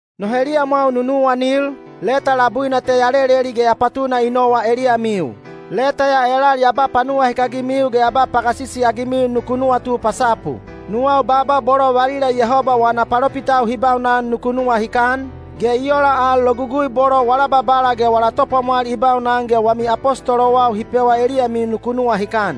No heliyamwau nunuwanil, leta labuina te ya leleli ge ya patuna i nowa eliyamiu. Leta ya elal ya ba panuwahikagimiu ge ya ba pagasisi-agimiu nuku nuwatu pasapu. Nuwau baaba bolo valila Yehoba wana palopitau hi baunan nuku nuwahikan, ge i ola al logugui bolo wala Babala ge wala Topwamwal i baunan ge wami apostolowau hi pewa eliyamiu nuku nuwahikan.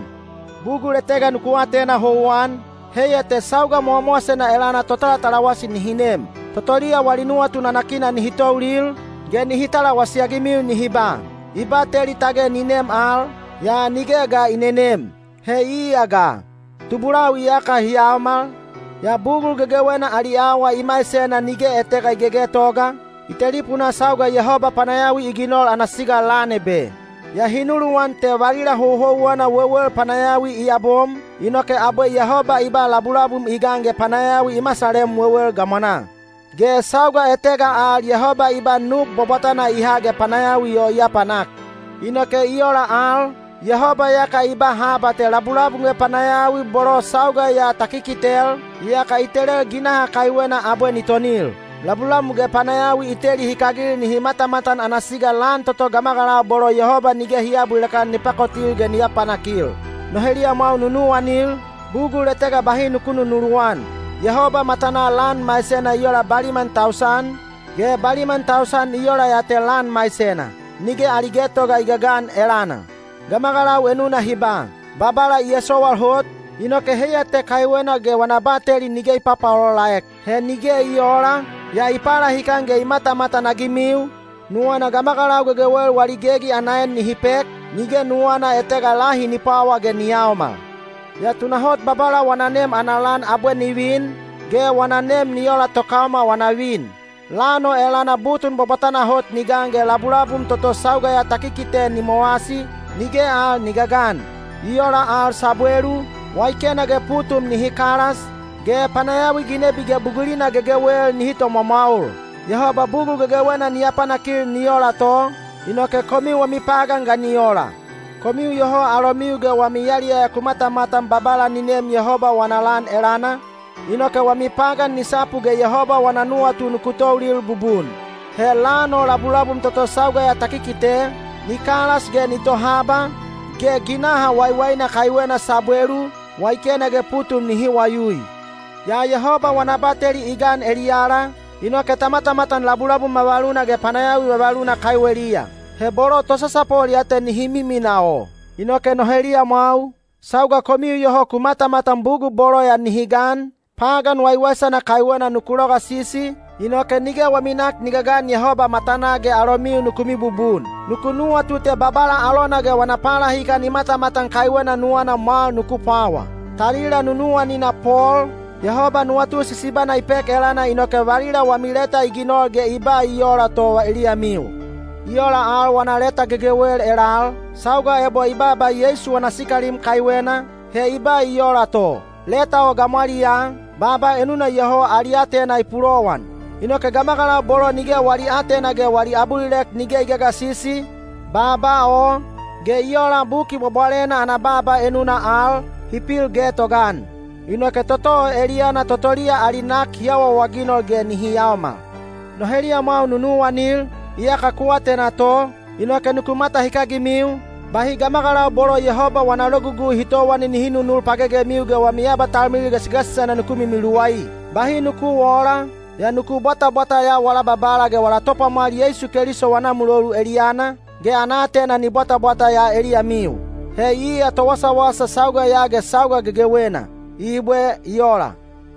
Bugul etega nuku atena houwan, heiya te sauga mowamowasena elana totalatalawasi nihi nem. Totoliya wali nuwatu nanakina nihi toulil, ge nihi talawasi-agimiu nihi ba, “I bateli tage ni nem al, yaa nige ga i nenem. He iya ga? Tubulau iyaka hi yaomal, yaa bugul gegewena ali awa i maisena nige etega i gegetoga, i telipunaa sauga Yehoba panayawi i ginol ana siga lan ebe.” Yaa hi nuluwan te valila houhouwena wewel panayawi i yabom, inoke abwe Yehoba i ba labulabum i gan ge panayawi i masalem wewel gamwanaa. Ge sauga etega al Yehoba i ba nub bwabwatana i ha ge panayawi o i apanak. Inoke i ola al, Yehoba iyaka i ba haba te labulabum ge panayawi bolo sauga ya ta kikitel, iyaka i telel ginaha kaiwena abwe ni tonil. Labulabum ge panayawi i teli hikagil nihi matamatan ana siga lan toto gamagalau bolo Yehoba nige hi aabulilek-an ni pakotil ge ni apanakil. No heliyamwau nunuwanil, bugul etega bahi nuku nunuluwan: Yehoba matanaa lan maisena i ola baliman tausan, ge baliman tausan i ola ya te lan maisena. Nige ali getoga i gagan elana. Gamagalau enuna hi ba, “Babala i esowal hot, inoke heiya te kaiwena ge wana bateli nige i papaolaolaek.” He nige i oola, yaa i palahikan ge i matamatan-agimiu, nuwana gamagalau gegewel wali gegi ana en nihi pek, nige nuwana etega lahi ni pwawa ge ni yaomal. Yaa tunahot Babala wana nem ana lan abwe ni vin, ge wana nem ni ola tokaoma wana vin. Lan o elana butun bwabwatana hot ni gan ge labulabum toto sauga ya ta kikite ni mowasi, nige al ni gagan. I ola al sabwelu, waikena ge putum nihi kalas, ge panayawi ginebi ge bugulina gegewel nihi tomwamwaol. Yehoba bugul gegewena ni apanakil ni ola to, inoke komiu wami pagan ga ni ola? Komiu iyoho alomiu ge wami yaliyaya ku matamatan Babala ni nem Yehoba wana lan elana, inoke wami pagan ni sapu ge Yehoba wana nuwatu nuku toulil bubun. He lan o labulabum toto sauga ya ta kikite, ni kalas ge ni tohaba, ge ginaha wawaina kaiwena sabwelu, waikena ge putum nihi wayui. Yaa Yehoba wana bateli i gan eliyala, inoke ta matamatan labulabum vavaluna ge panayawi vavaluna kaiweliya. He bolo tosasapol ya te nihi miminaa o. Inoke no heliyamwau, sauga komiu iyoho ku matamatan bugul bolo ya nihi gan, pagan waiwaisana kaiwena nuku logasisi, inoke nige wami nak ni gagan Yehoba matanaa ge alomiu nuku mibubun. Nuku nuwatu te Babala alona ge wana palahikan i matamatan kaiwena nuwana mwal nuku pwawa. Talila nunuwanina Pol, Yehoba nuwatu sisibana i pek elana inoke valila wami leta i ginol ge i ba i ola to eliyamiu. I ola al wana leta gegewel elal, sauga ebo i baaba Yeisu wana sikalim kaiwena, he i ba i ola to. Leta o gamwaliyaa, baaba enuna iyoho ali aatena i pulowan. Inoke gamagalau bolo nige wali aatena ge wali abulilek nige i gagasisi, baaba o, ge i ola Buki Bwabwalena ana baaba enuna al, hi pil getogaan. Inoke toto o eliyana totoliya ali nak hi awaawaginol ge nihi yaomal. No heliyamwau nunuwanil, iyaka ku atena to, inoke nuku matahikagimiu, bahi gamagalau bolo Yehoba wana logugui hi towani nihi nunul pagegemiu ge wami abatalmilil gasigasisena nuku mimiluwai. Bahi nuku oola, yaa nuku bwatabwata ya wala Babala ge wala Topwamwal Yeisu Keliso wana mulolu eliyana, ge ana aatena ni bwatabwata ya eliyamiu. He iya towasawasa sauga ya ge sauga gegewena! Ibwe. I ola.